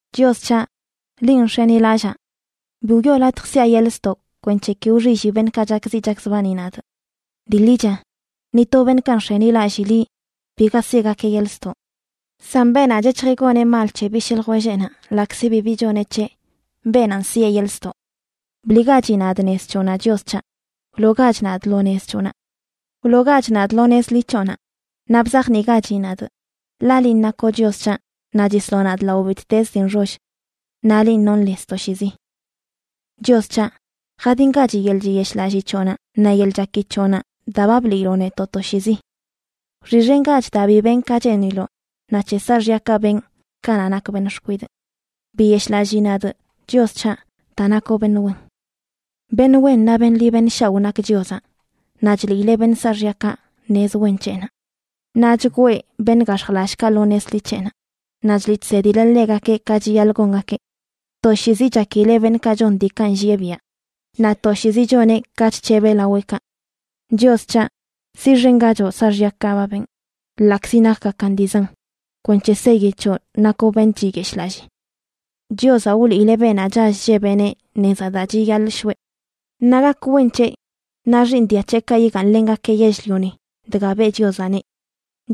Chios c̱haꞌ, linꞌ nx̱enilallaa. Bi wiꞌo latj siꞌa yeḻꞌ ztoꞌ kwenc̱he ki wxilli beṉꞌkaꞌ chakziꞌ chakzbani nadꞌ. Dii ḻicha ni to beṉꞌkaꞌ nx̱enilallii liꞌ biga siꞌgakeꞌ yeḻꞌ ztoꞌ; san beenaꞌ chec̱hjeꞌ goneꞌ mal c̱he bishꞌ ljwelleꞌnaꞌ ḻaꞌkzi bibi choneꞌ c̱heꞌ, beenanꞌ siꞌe yeḻꞌ ztoꞌ. Bliꞌgachi nadꞌ nez c̱hoꞌnaꞌ, Chios c̱haꞌ, wloogach nadꞌ lo nez c̱hoꞌnaꞌ. Wloogach nadꞌ lo nez ḻi c̱hoꞌnaꞌ naꞌ bzajniꞌgachi nadꞌ, ḻaꞌ linꞌ nakoꞌ Chios c̱haꞌ naꞌ chisloꞌ nadꞌ lao bittez dii nxoll. ¡Naꞌ linꞌ nonꞌ lez toshiizi! Chios c̱haꞌ, jadingachi yeḻꞌ chiyeshꞌlallii c̱hoꞌnaꞌ naꞌ yeḻꞌ chaki c̱hoꞌnaꞌ daa ba bliiloꞌ netoꞌ toshiizi. Wxiꞌxengach daa bi benꞌ ka cheeniloꞌ, naꞌ c̱he saaxyakaꞌ benꞌ kanaꞌ nakꞌ beṉꞌ xkwidꞌ. Biyeshꞌlallii nadꞌ, Chios c̱haꞌ, daa nakoꞌ beṉꞌ wen. Beṉꞌ wen naꞌ beṉꞌ ḻi beṉꞌ shaoꞌ nak Chiozaꞌ, naꞌ chliileꞌ beṉꞌ saaxyakaꞌ nez wen c̱heꞌnaꞌ. Naꞌ chgwee beṉꞌ gax̱jlallꞌkaꞌ lo nez ḻi c̱heꞌnaꞌ, naꞌ chliꞌ chsedileꞌ ḻegakeꞌ ka chiyaḻꞌ gongakeꞌ. Toshiizi chakileꞌ beṉꞌkaꞌ chon diikaꞌ nllieꞌ biaꞌ; naꞌ toshiizi choneꞌ ka chc̱hebeꞌ laweꞌkaꞌ. Chios c̱haꞌ, siꞌxengachoꞌ saaxyakaꞌ ba benꞌ ḻaꞌkzi nakgakan dii zan kwenc̱he seyi c̱hoꞌ nakoꞌ beṉꞌ chiyeshꞌlallii. Chiozaꞌ wliileꞌ beenaꞌ chall chllebeꞌneꞌ nezaꞌ daa chiyaḻꞌ shoꞌe. Naꞌ gak wen c̱heꞌ, naꞌ xiiṉ dia c̱heꞌkaꞌ yigaaṉlengakeꞌ yell-lioni dga beꞌ Chiozaꞌneꞌ.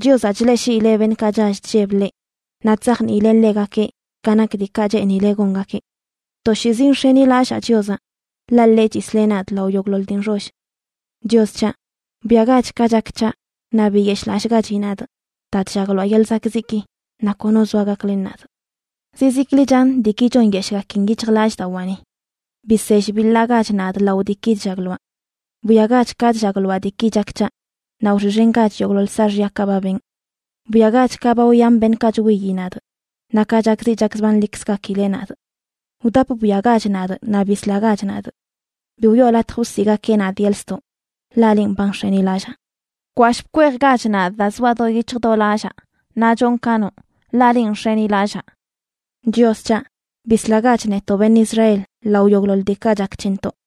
Chiozaꞌ chleꞌshiileꞌ beṉꞌkaꞌ chall chlleb ḻeꞌ, naꞌ chzajniileꞌ ḻegakeꞌ ka nak diikaꞌ cheenileꞌ gongakeꞌ. Toshiizi nx̱enilallaa Chiozaꞌ, ḻaꞌ ḻeꞌ chisleꞌ nadꞌ lao yogꞌḻoḻ dii nxoll. Chios c̱haꞌ, bwiagach ka chak c̱haꞌ, naꞌ biyeshꞌlallꞌgachi nadꞌ daa chllagloaꞌ yeḻꞌ zakꞌziꞌki naꞌ kono zoa gaklen nadꞌ. Zizikli chan diiki chonyeshꞌgakin yic̱hjlallꞌdawaani. Bisell biḻaꞌgach nadꞌ lao diiki chllagloaꞌ. Bwiagach ka chllagloaꞌ diiki chak c̱haꞌ, naꞌ wxiꞌxengach yogꞌḻoḻ saaxyakaꞌ ba benꞌ. Bwiagach ka ba wyan beṉꞌkaꞌ chwiyi nadꞌ, naꞌ ka chakziꞌ chakzbanlikzgakileꞌ nadꞌ. ¡Wdap bwiagach nadꞌ naꞌ bislagach nadꞌ! Bi wiꞌo latj wsiꞌgakeꞌ nadꞌ yeḻꞌ ztoꞌ, ḻaꞌ linꞌ ba nx̱enilallaa. Bkwashꞌ bkweejgach nadꞌ daa zoaꞌ do yic̱hj do lallaa naꞌ chonꞌ ka noꞌ, ḻaꞌ linꞌ nx̱enilallaa. Chios c̱haꞌ, bislagach netoꞌ beṉꞌ Israel lao yogꞌḻoḻ diikaꞌ chak c̱hentoꞌ.